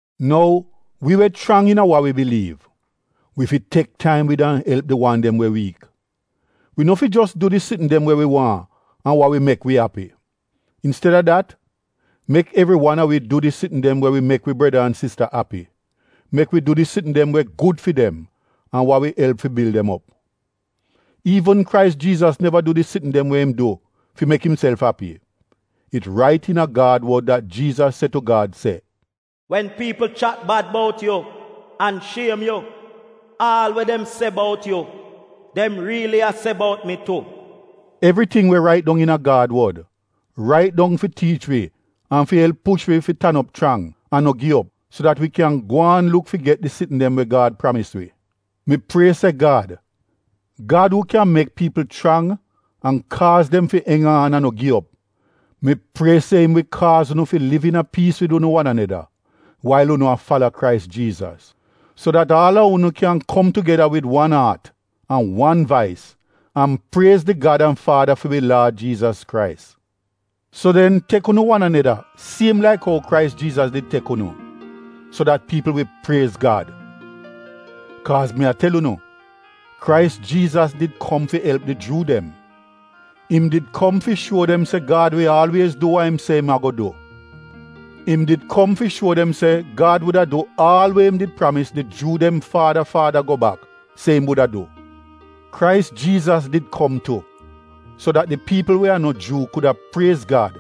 Nou wi we chrang iina wa wi biliiv, wi fi tek taim wid an elp di wan de we wiik. Wi no fi jos du di sitn dem we wi waahn an wa wi mek wi api. Insteda dat mek evri wan a wi du di sitn dem we wi mek wi breda an sista api, mek wi du di sitn dem we gud fi dem an wa wi elp fi bil dem op. Iivn Krais Jiizas neva du di sitn dem we im du fi mek imself api. It rait iina Gad wod dat Jiizas se tu Gad se, “Wen piipl chat bad bout yu an shiem yu, aal we dem se bout yu, dem riili a se bout mi tu.” Evriting we rait dong iina Gad wod, rait dong fi tiich wi an fi elp push wi fi tan op chrang an no gi op so dat wi kyan gwaan luk fi get di sitn dem we Gad pramis wi. Mi prie se Gad, Gad uu kyan mek piipl chrang an kaaz dem fi eng aan an no gi op, mi prie se im wi kaaz unu fi liv iina piis wid unu wan aneda wail unu a fala Krais Jiizas. So dat aal a unu kyan kom tugeda wid wan aat an wan vais an priez di Gad an Faada fi wi Laad Jiizas Krais. So den tek unu wan aneda siem laik ou Krais Jiizas did tek unu, so dat piipl wi priez Gad. Kaaz mi a tel unu, Krais Jiizas did kom fi elp di Juu dem. Im did kom fi shuo dem se Gad wi aalwiez du wa im se im ago du — im did kom fi shuo dem se Gad wuda du aal we im did pramis di Juu dem faada faada go bak se im wuda du. Krais Jiizas did kom tu, so dat di piipl we a no Juu kuda priez Gad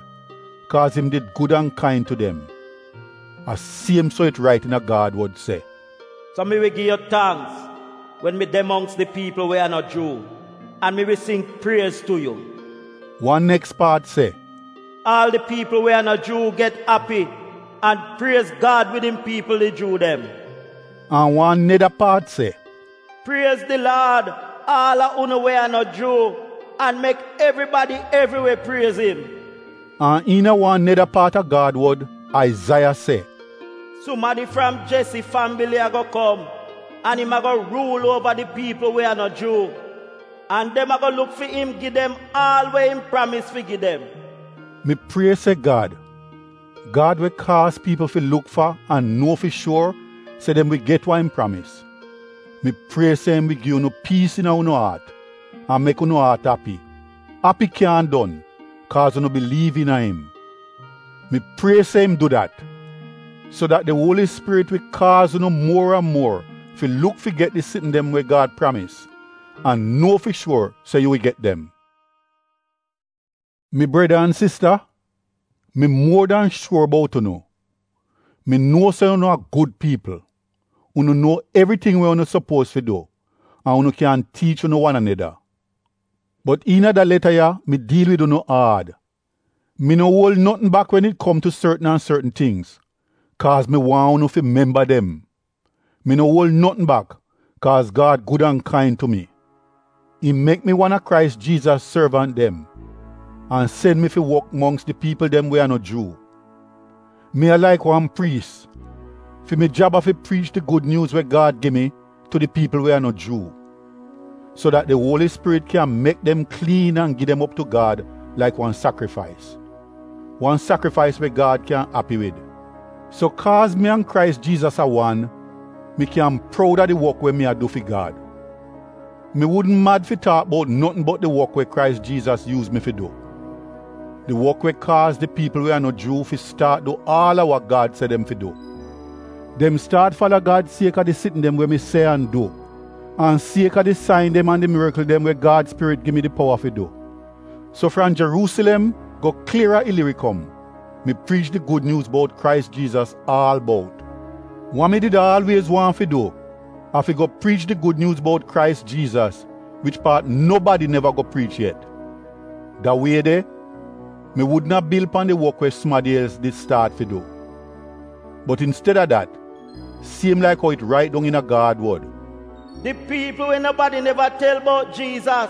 kaaz im did gud an kain tu dem. A siem so it rait iina Gad wod se: “So mi wi gi yu tangks wen mi de mongks di piipl we a no Juu, an mi wi sing priez tu yu.” Wan neks paat se: “Aal di piipl we a no Juu get api an priez Gad wid im piipl di Juu dem.” An wan neda paat se: “Priez di Laad aal a unu we a no Juu, an mek evribadi evriwe priez im.” An iina wan neda paat a Gad wod, Aizaiya se: “Sumadi fram Jesi fambili ago kom, an im ago ruul uova di piipl we a no Juu, an dem ago luk fi im gi dem aal we im pramis fi gi dem.” Mi prie se Gad, Gad we kaaz piipl fi luk fa an nuo fi shuor se dem wi get wa im pramis, mi prie se im wi gi unu piis iina unu aat an mek unu aat api, api kyaahn don kaaz unu biliiv iina im. Mi prie se im du dat, so dat di Uoli Spirit wi kaaz unu muor an muor fi luk fi get di sitn dem we Gad pramis an nuo fi shuor se yu wi get dem. Mi breda an sista, mi muor dan shuor bout unu, mi nuo se unu a gud piipl, unu nuo evriting we unu sopuoz fi du an unu kyan tiich unu wan aneda. Bot iina da leta ya mi diil wid unu aad, mi no uol notn bak wen it kom tu sortn an sortn tingz kaaz mi waahn unu fi memba dem. Mi no uol notn bak kaaz Gad gud an kain tu mi, im mek mi wan a Krais Jiizas sorvant dem an sen mi fi wok mongks di piipl dem we a no Juu. Mi a laik wan priis, fi mi jab a fi priich di Gud Nyuuz we Gad gi mi tu di piipl we a no Juu, so dat di Uoli Spirit kyan mek dem kliin an gi dem op tu Gad laik wan sakrifais, wan sakrifais we Gad kyan api wid. So kaaz mi an Krais Jiizas a wan, mi kyan proud a di wok we mi a du fi Gad. Mi wudn mad fi taak bout notn bot di wok we Krais Jiizas yuuz mi fi du — di wok we kaaz di piipl we a no Juu fi staat du aal a wa Gad se dem fi du. Dem staat fala Gad kaaz a di sitn dem we mi se an du, an kaaz a di sain dem an di mirikl dem we Gad Spirit gi mi di powa fi du. So fram Jeruusilem go klier a Ilirikom, mi priich di Gud Nyuuz bout Krais Jiizas aal bout. Wa mi did aalwiez waahn fi du a fi go priich di Gud Nyuuz bout Krais Jiizas wich paat nobadi neva go priich yet. Da wie de mi wudn a bil pan di wok we sumadi els di staat fi du, bot insteda dat, siem laik ou it rait dong iina Gad wod: “Di piipl we nobadi neva tel bout Jiizas,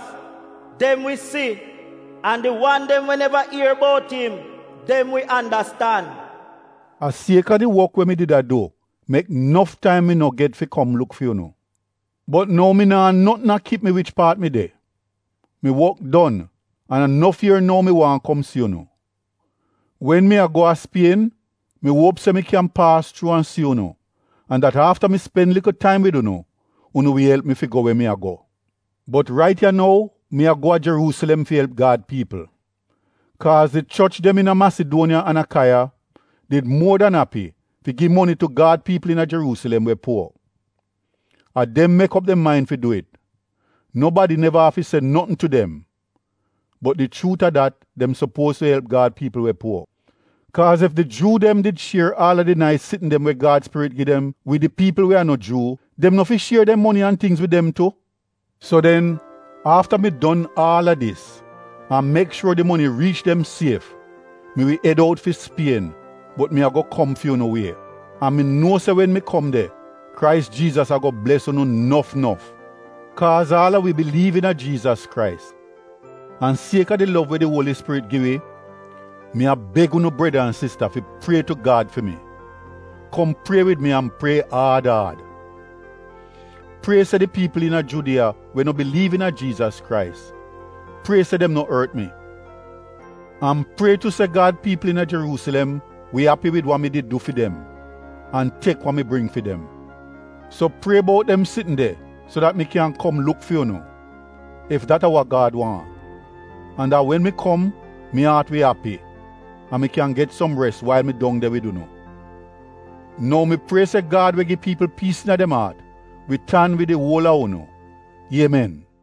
dem wi si an di wan dem we neva ier bout im, dem wi andastan.” A kaaz a di wok we mi did a du, mek nof taim mi no get fi kom luk fi unu. Bot nou mi naa notn a kip mi wich paat mi de, mi wok don an a nof ier nou mi waahn kom si unu. Wen mi a go a Spien, mi uop se mi kyan paas chuu an si unu an dat afta mi spen likl taim wid unu, unu wi elp mi fi go we mi a go. Bot rait ya nou mi a go a Jeruusilem fi elp Gad piipl. Kaaz di choch dem iina Masiduoniya an Akaiya did muor dan api fi gi moni tu Gad piipl iina Jeruusilem we puor. A dem mek op dem main fi du it, nobadi neva afi se notn tu dem, bot di chuut a dat dem sopuoz fi elp Gad piipl we puor. Kaaz ef di Juu dem did shier aal a di nais sitn dem we Gad spirit gi dem wid di piipl we a no Juu, dem no fi shier dem moni an tingz wid dem tu. So den afta mi don aal a dis an mek shuor di moni riich dem sief, mi wi ed out fi Spien bot mi ago kom fi unu wie, an mi nuo se wen mi kom de, Krais Jiizas ago bles unu nof nof. Kaaz aal a wi biliiv iina Jiizas Krais, an sieka di lov we di Uoli Spirit gi wi, mi a beg unu breda an sista fi prie tu Gad fi mi. Kom prie wid mi an prie aad aad. Prie se di piipl iina Judiya we no biliiv iina Jiizas Krais, prie se dem no ort mi. An prie tu se Gad piipl iina Jeruusilem wi api wid wa mi did du fi dem an tek wa mi bring fi dem. So prie bout dem sitn de so dat mi kyan kom luk fi unu, ef dat a wa Gad waahn, an dat wen mi kom mi aat wi api an mi kyan get som res wail mi dong de wid unu. Nou mi prie se Gad we gi piipl piis iina dem aat wi tan wid di uol a unu. Iemen!